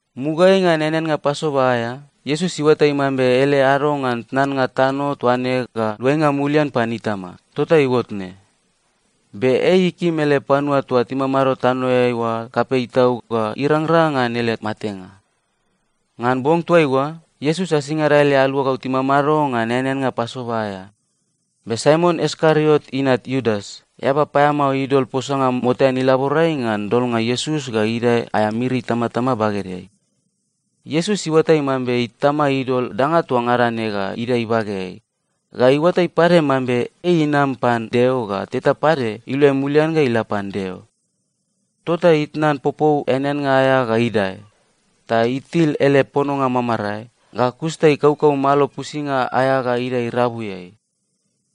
Mugaeai ngan eaneannga Pasova aea, Iesus iuatai mambe ele ado ngan tnannga tano toa ne ga luainga mulian pan Itama, tota iuot ne. Be ei ikim ele panua toa timamado tanoeai oa kapei tau ga irangrang ngan ele matenga. Ngan bong toaiua, Iesus asingada ele aluagau timamado ngan eaneannga Pasova aea. Be Saimon Iskariot inat Iudas, eaba paeamao idol posanga motean ilaborai ngan dolnga Iesus ga idae aea miri itamatama bagedeai. Iesus iuatai mambe Itama idol danga toa ngada ne ga idae ibageai. Ga iuatai pade mambe ei inam pan Deo ga teta pade iluai mulian ga ila pan Deo. Tota itnan popou eaneannga aea ga idae. Ta itil ele pononga mamarae, ga kus ta ikaukau malo pusinga aea ga idae irabuiai.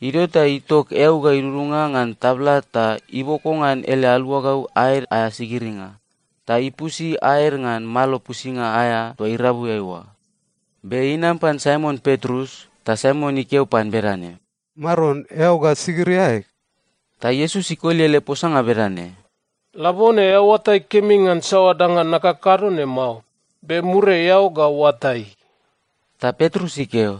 Idio ta itok eau ga idudunga ngan tabla ta iboko ngan ele aluagau aed aea sigiringa, ta ipusi aed ngan malo pusinga aea toa irabuiai oa. Be inam pan Saimon Petrus, ta Saimon ikeo pan bedane, “Maron, eao ga sigiri aeg?” Ta Iesus ikoli ele posanga bedane, “Labone eao oatai kemi ngan saoa danga nakakado ne mao. Be muriai eao ga oatai.” Ta Petrus ikeo,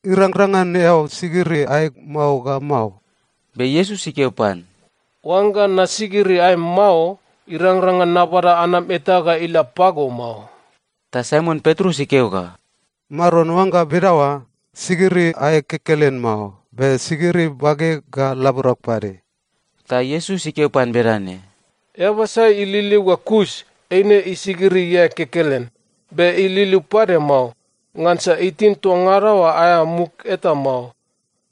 “Irangrang ngan eao sigiri aeg mao ga mao!” Be Iesus ikeo pan, “Oangga nasigiri aem mao, irangrang ngan nabada anam eta ga ila pago mao.” Ta Saimon Petrus ikeo ga, “Maron, oangga bedaoa, sigiri aeg kekelen mao. Be sigiri bageg ga laborag pade!” Ta Iesus ikeo pan bedane, “Eaba sai ililiu ga kus, eine isigiri iae kekelen. Be ililiu pade mao, ngansa itin toa ngada oa aea muk eta mao.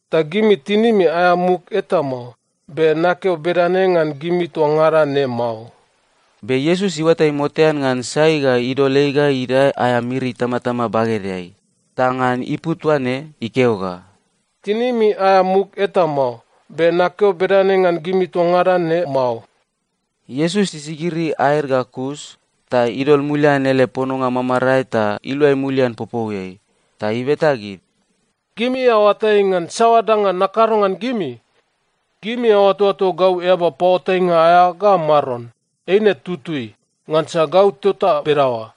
Ta gimi tinimi aea muk eta mao, be nakeo bedane ngan gimi toa ngada ne mao.” Be Iesus iuatai motean ngan sai ga idol ei ga idae aea miri itamatama bagedeai, ta ngan ipu toaine ikeo ga, “Tinimi aea muk eta mao, be nakeo bedane ngan gimi toa ngada ne mao.” Iesus isigiri aed ga kus, ta idol mulian ele pononga mamarae ta iluai mulian popouiai. Ta ibeta gid, “Gimi aoatai ngan saoa danga nakado ngan gimi? Gimi aoatoato gau eaba paoatainga aea ga Maron, eine tutui, ngansa gau tota bedaoa.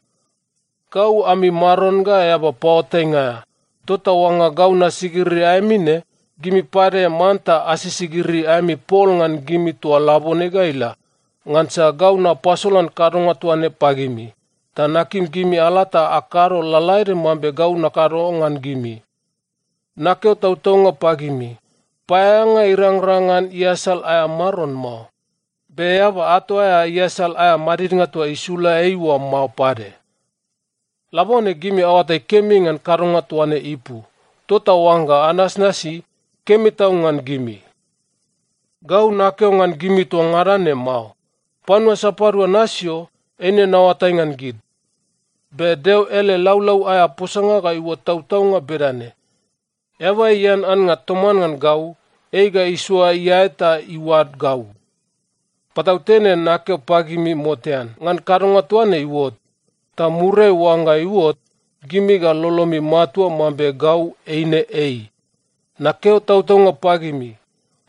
Gau ami Maron ga eaba paoatainga aea, tota oangga gau nasigiri aemi ne, gimi pade manta asisigiri aemi pol ngan gimi toa labone ga ila. Ngansa gau napasolan kadonga toa ne pagimi, ta nakim gimi ala ta akado lalaede mambe gau nakado ngan gimi. Nakeo tautaunga pagimi, paeaeanga irangrang ngan iasal aea maron mao. Be eaba ato aea iasal aea madidnga toa isula ei oa mao pade. Labone gimi aoatai kemi ngan kadonga toa ne ipu, tota oangga anasnasi, kemi tau ngan gimi. “Gau nakeo ngan gimi toa ngada ne mao. Panua sapadua nasio, eine naoatai ngan gid. Be Deo ele laulau aea posanga ga iuot tautaunga bedane, ‘Eaba ian annga toman ngan gau, ei ga isoa iae ta iuad gau.’ “Patautene nakeo pagimi motean ngan kadonga toa ne iuot. Ta muriai oangga iuot, gimi ga lolomi matua mambe Gau eine Ei. Nakeo tautaunga pagimi,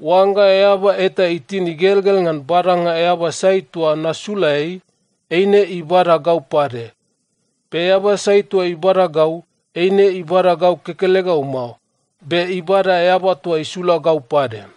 oangga eaba eta itin igelgel ngan badanga eaba sai toa nasula ei, eine ibada gau pade. Be eaba sai toa ibada gau, eine ibada gau kekelegau mao, be ibada Eaba toa isula gau pade.”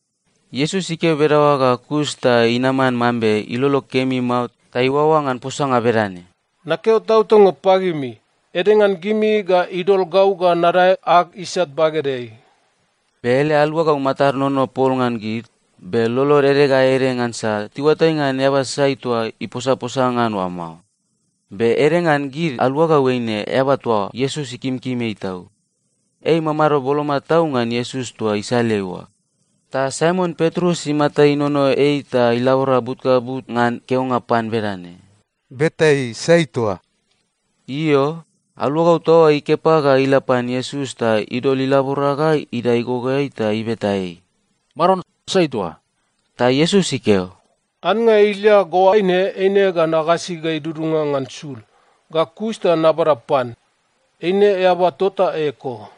Iesus ikeo bedaoa ga kus ta inaman mambe ilolo kemi mao ta iuaoa ngan posanga bedane, “Nakeo tautaunga pagimi, ede ngan gimi ga idol gau ga nadae ag isat bagedeai.” Be ele aluagau matad inono pol ngan gid, be lolod ede ga ede ngansa tiuatai ngan eaba sai toa iposaposa ngan oa mao. Be ede ngan gid aluagau eine eaba toa Iesus ikimkim ei tau. Ei imamado boloma tau ngan Iesus toa isaleai oa. Ta Saimon Petrus imata inono ei ta ilabora but ga but ngan keonga pan bedane, “Beta ei, sai toa.” Io, aluagau toa oa ikepa ga ila pan Iesus ta idol ilabora ga idae igogoeai ta ibeta ei, “Maron, sai toa?” Ta Iesus ikeo, “Annga ilia ga oaine eine ga nagasi ga idudunga ngan sul, ga kus ta nabada pan. Eine eaba tota eko.”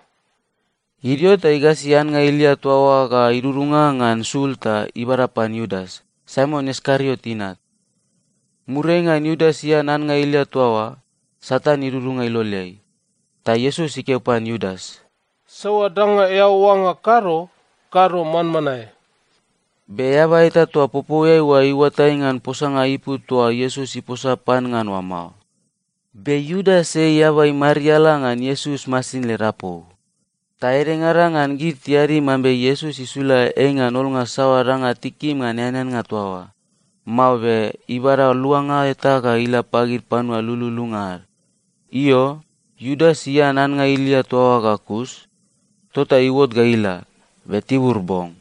Idio ta igasi annga ilia toa oa ga idudunga ngan sul ta ibada pan Iudas, Saimon Iskariot inat. Muriai ngan Iudas ian annga ilia toa oa, Satan idudunga iloleai. Ta Iesus ikeo pan Iudas, “Saoa danga eao oangga kado, kado manmanae.” Be eaba eta toa popouiai oa iuatai ngan posanga ipu toa Iesus iposa pan ngan oa mao. Be Iudas ei eaba imariala ngan Iesus masin led apou. Ta edengada ngan gid tiadi mambe Iesus isula ei ngan olnga saoa danga tikim ngan eaneannga toa oa, mao be ibada luanga eta ga ila pagid panua lululunga ad. Io, Iudas ian annga ilia toa oa ga kus, tota iuot ga ila, be tibur bong.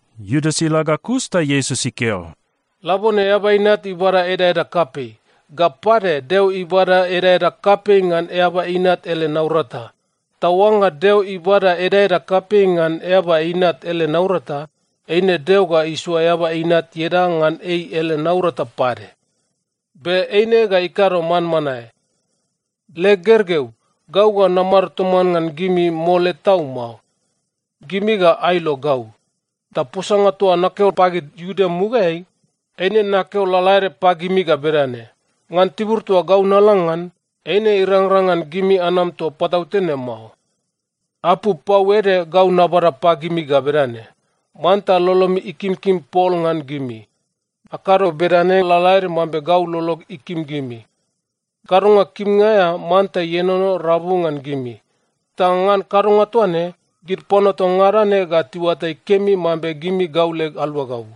Iudas ila ga kus ta Iesus ikeo, “Labone Eaba Inat ibada edaeda kapei. Ga pade, Deo ibada edaeda kapei ngan Eaba Inat ele naurata. Ta oangga Deo ibada edaeda kapei ngan Eaba Inat ele naurata, eine Deo ga isoa Eaba Inat ieda ngan ei ele naurata pade. Be eine ga ikado manmanae. “Leg gergeu, gau ga namado toman ngan gimi mole tau mao. Gimi ga ailo gau. Ta posanga toa nakeo pagid Iuda mugaeai, eine nakeo lalaede pagimi ga bedane: Ngan tibur toa gau nala ngan, eine irangrang ngan gimi anam toa patautene mao. “Apu pau ede gau nabada pagimi ga bedane: Manta lolomi ikimkim pol ngan gimi. Akado bedane lalaede mambe gau lolog ikim gimi. Kadonga kimnga aea manta ienono rabu ngan gimi. Ta ngan kadonga toa ne, gid panua toa ngada ne ga tiuatai kemi mambe gimi gau leg aluagau.”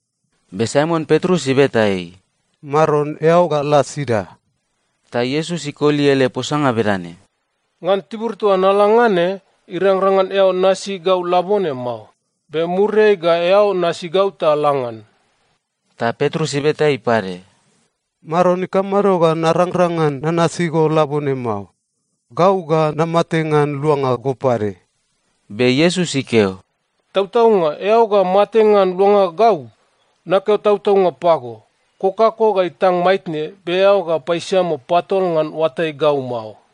Be Saimon Petrus ibeta ei, “Maron, eao ga la sida?” Ta Iesus ikoli ele posanga bedane, “Ngan tibur toa nala ngan ne, irangrang ngan eao nasi gau labone mao. Be muriai ga eao nasi gau ta la ngan.” Ta Petrus ibeta ei pade, “Maron, ikamado ga narangrang ngan nanasi go labone mao? Gau ga namate ngan luanga go pade!” Be Iesus ikeo, “Tautaunga eao ga mate ngan luanga gau? Nakeo tautaunga pago, kokako ga itang maitne, be eao ga paisiamo patol ngan oatai gau mao.”